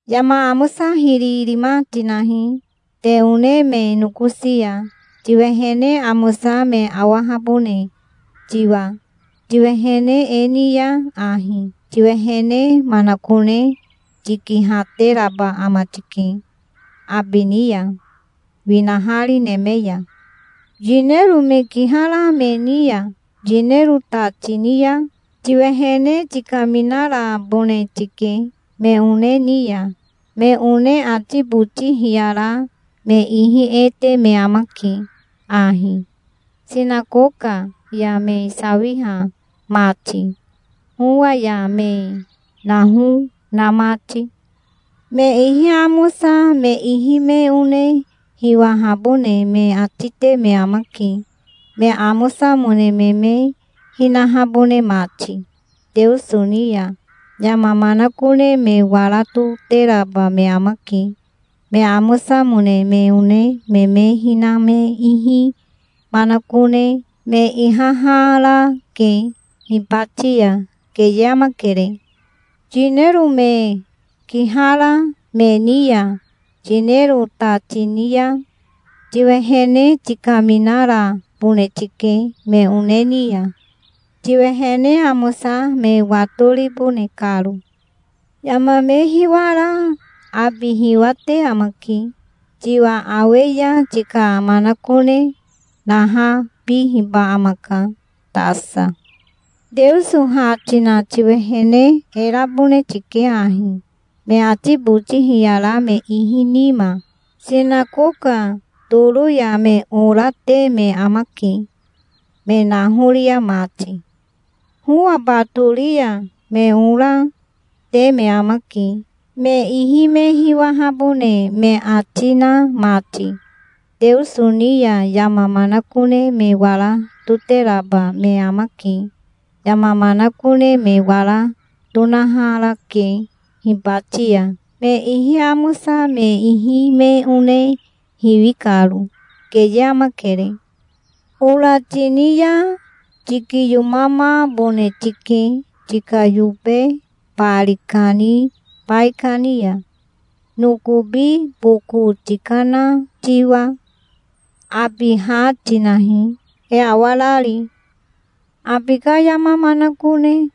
"Yama amosa hiri rima tinahi te one me nokosi ya, tiwehene amosa me awahabone tiwa. Tiwehene e ni ya ahi tiwehene manakone tikihateraba ama tike abi ni ya, winahari neme ya". "Yinero me kihara me ni ya yinero ta tini ya tiwehene tikaminarabone tike me one ni ya. Me one ati boti hiyara me ihi e te me amake ahi, sinakoka ya me sawiha mati, howa ya me naho na mati. Me ihi amosa me ihi me one hiwahabone me ati te me amake, me amosamone me me hinahabone mati. Teoso ni ya yama manakone me wara toteraba me amake. Me amosamone me one me me hina me ihi manakone me ihaharake hibati ya. Keye amakere. Yinero me kihara me ni ya yinero ta tini ya tiwehene tikaminarabone tike me one ni ya, tiwehene amosa me watoribone karo. Yama me hiwara abi hiwate amake. Tiwa awe ya tika manakone nahabihiba amaka tasa". "Teoso ha tina tiwehene e rabone tike ahi, me ati boti hiyara me ihi nima. Sinakoka toro ya me ora te me amake, me nahoria mati. Howa batori ya me ora, te me amake, me ihi me hiwahabone me ati na mati. Teoso ni ya yama manakone me wara toteraba me amake. Yama manakone me wara tonaharake hibati ya, me ihi amosa me ihi me one hiwi karo. Keye amakere. Ora tini ya tikiyomamabone tike tika yobe bari kani baikani ya, nokobi boko tikana tiwa. Abi ha tinahi, e awarari. Abi ka yama manakone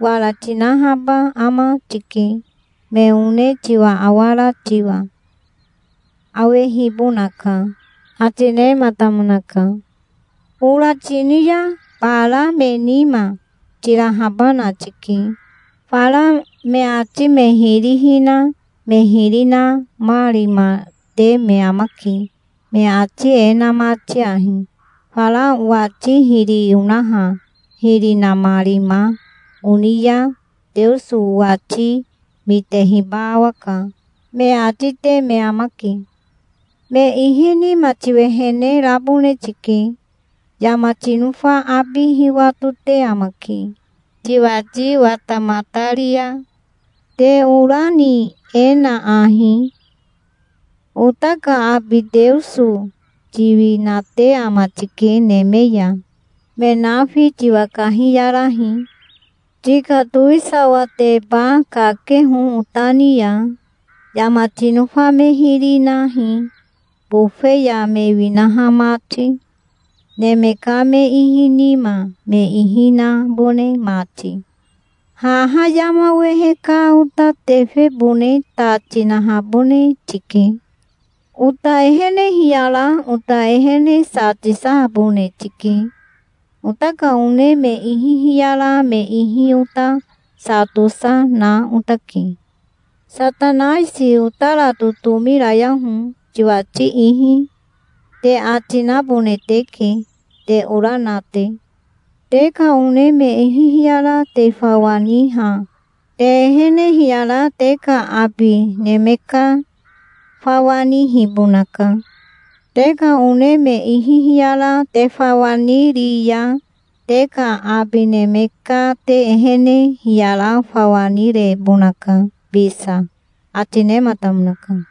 wara tinahaba ama tike. Me one tiwa awara tiwa awehibonaka", ati nematamonaka. "Ora tini ya bara me nima tirahabana tike. Fara me ati me hiri hina me hiri namarima te me amake, me ati e na mati ahi: 'Fara owati hiri onaha hiri namarima oni ya Teoso owati mitehiba awaka', me ati te me amake. Me ihi nima tiwehene rabone tike. Yama tinofa abi hiwatote amake, tiwati watamatari ya". "Te ora ni e na ahi: 'Ota ka abi Teoso tiwinate ama tike neme ya. Me nafi tiwa kahiyarahi. Tika towisawateba kakeho ota ni ya. Yama tinofa me hiri nahi, bofe ya me winaha mati, neme ka me ihi nima me ihi nabone mati. Haha yama wehe ka ota tefebone ta tinahabone tike. Ota ehene hiyara ota ehene sa tisahabone tike. Ota ka one me ihi hiyara me ihi ota sa tosa na otake. Satanaisi otara totomi rayaho tiwati ihi', te ati nabone teke, te ora na te. Te ka one me ihi hiyara te fawa niha te ehene hiyara te ka abi neme ka fawa nihibonaka. Te ka one me ihi hiyara te fawa niri ya te ka abi neme ka te ehene hiyara fawa nirebonaka bisa", ati nematamonaka.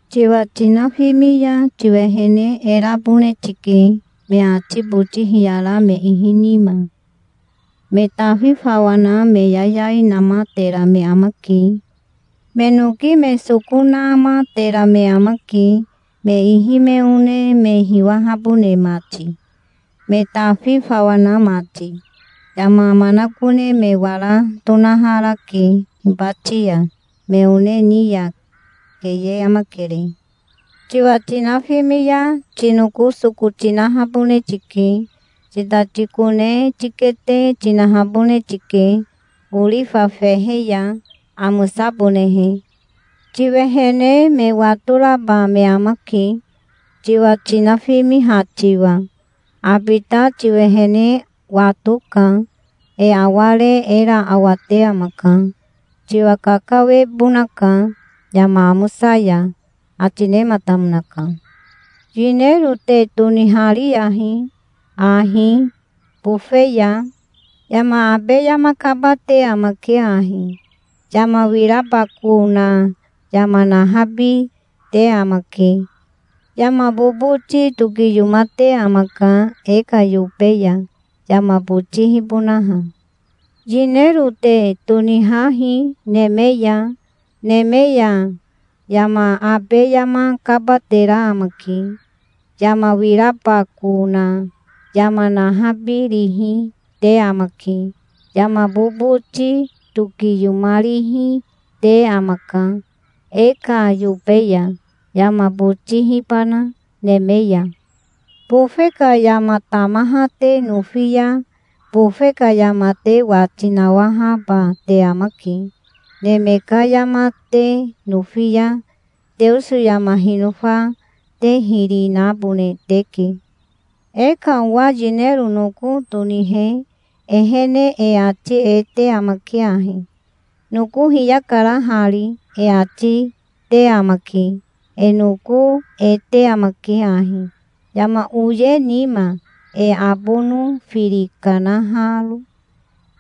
"Tiwa tinafimi ya tiwehene e rabone tike, me ati boti hiyara me ihi nima. Me tafi fawa na me yayai namatera me amake. Me noki me soko namatera me amake, me ihi me one me hiwahabone mati, me tafi fawa na mati. Yama manakone me wara tonaharake hibati ya, me one ni ya. Keye amakere. Tiwa tinafimi ya tinoko soko tinahabone tike. Titati kone tikete tinahabone tike orifa fehe ya, amosabonehe. Tiwehene me watoraba me amake, tiwa tinafimiha tiwa. Abi ta tiwehene watoka. E aware era awate amaka. Tiwa kakawebonaka yama amosa ya", ati nematamonaka. "Yinero te tonihariyahi ahi, bofe ya. Yama abe yama kabate amake ahi. Yama wirabako na yama nahabi, te amake. Yama boboti tokiyomate amaka e ka yobe ya, yama botihibonaha. Yinero te tonihahi neme ya. Neme ya yama abe yama kabatera amake. Yama wirabako na yama nahabirihi, te amake. Yama boboti tokiyomarihi, te amaka e ka yobe ya, yama botihibana neme ya. Bofe ka yama tamaha te nofi ya bofe ka yama te wati nawahaba te amake. Neme ka yama te nofi ya Teoso yama hinofa te hiri nabone teke. E ka owa yinero noko tonihe ehene e ati e te amake ahi: 'Noko hiyakara hari', e ati te amake. E noko e te amake ahi, yama oye nima, e abono firi kanaharo.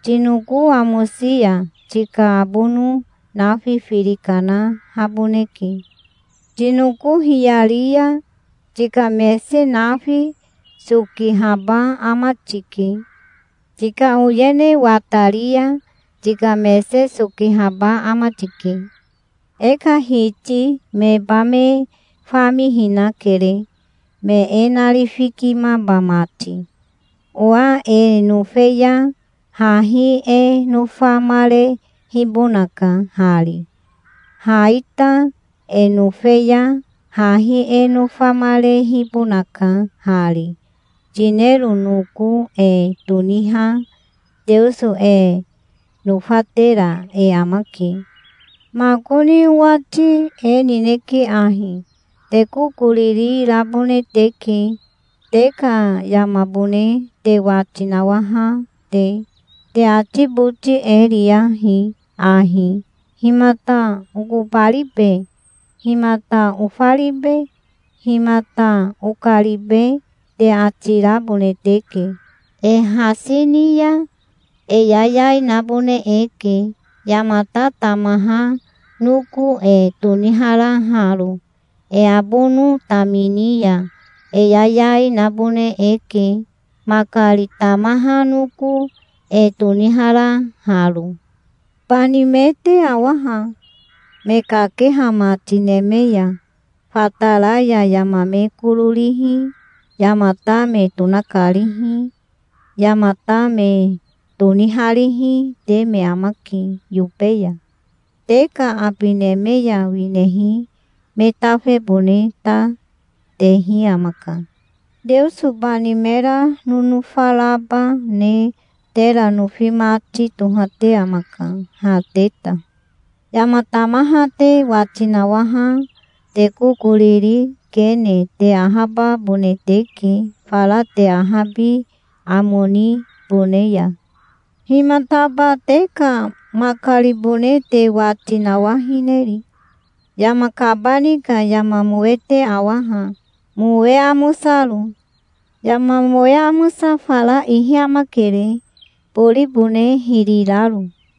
Tinoko amosi ya tika abono nafi firi kanahaboneke. Tinoko hiyari ya tika mese nafi sokihaba ama tike. Tika oyene watari ya tika mese sokihaba ama tike. E ka hiti meba me famihinakere, me e narifikimaba mati. Owa e nofe ya hahi e nofamarehibonaka hari. Ha ita e nofe ya hahi e nofamarehibonaka hari. Yinero noko e toniha Teoso e nofatera e amake". "Makoni owati e nineke ahi: Te kokoriri rabone teke, te ka yamabone te wati nawaha te. Te ati boti e riyahi ahi: 'Himata okobaribe? Himata ofaribe? Himata okaribe?' te ati rabone teke. E hasi ni ya e yayai nabone eke, yamata tamaha noko e toniharaharo. E abono tamini ya e yayai nabone eke, makari tamaha noko e toniharaharo. Bani me te awa ha, me kakeha mati neme ya. Fatara ya yama me koro rihi, yamata me tonakarihi, yamata me toniharihi, te me amake yobe ya. Te ka abi neme ya winehi me tafebone ta tehi amaka. Teoso bani mera nonofa raba ne tera nofi mati tohate amaka, ha te ta. Yama tamaha te wati nawaha te kokoriri kene te ahababone teke fara te ahabi amo nibone ya". "Himataba te ka makaribone te wati nawahineri? Yama kabani ka yama mowe te awa ha, mowe amosaro. Yama mowe amosa fara ihi amakere, boribone hiri raro.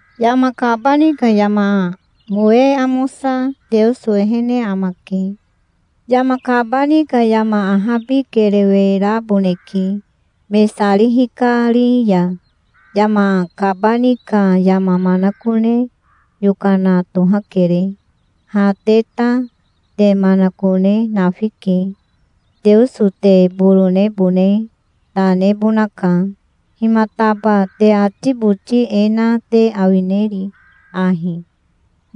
Yama kabani ka yama mowe amosa Teoso ehene amake. Yama kabani ka yama ahabi kerewe raboneke, me sari hikari ya. Yama kabani ka yama manakone yokana tohakere. Ha te ta te manakone nafike. Teoso te boronebone ta nebonaka. Himataba te ati boti e na te awineri ahi: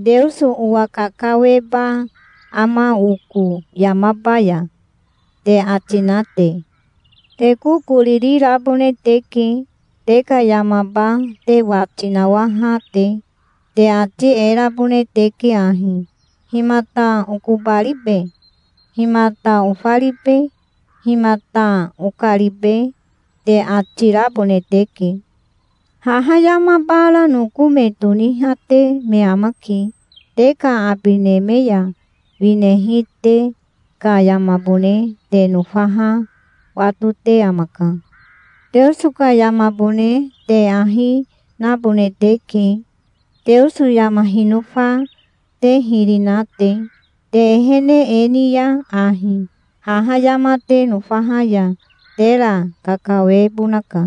'Teoso owa kakaweba ama oko yamaba ya?' te ati na te?" "Te kokoriri rabone teke, te ka yamaba te wati nawaha te. Te ati e rabone teke ahi: 'Himata okobaribe? Himata ofaribe? Himata okaribe?' te ati rabone teke. Haha yama bara noko me tonihate me amake. Te ka abi neme ya winehi te ka yamabone te nofaha watote amaka. Teoso ka yamabone te ahi nabone teke, Teoso yama hinofa te hiri na te. Te ehene e ni ya ahi haha yama te nofaha ya tera kakawebonaka.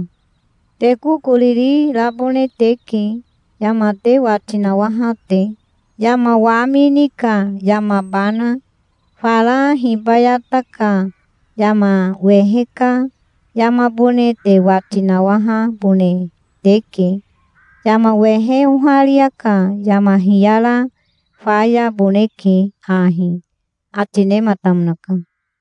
Te kokoriri rabone teke, yama te wati nawaha te, yama wamini ka yamabana. Fara hibayata ka yama wehe ka yamabone te wati nawahabone teke. Yama wehe oharia ka yama hiyara fayaboneke ahi", ati nematamonaka.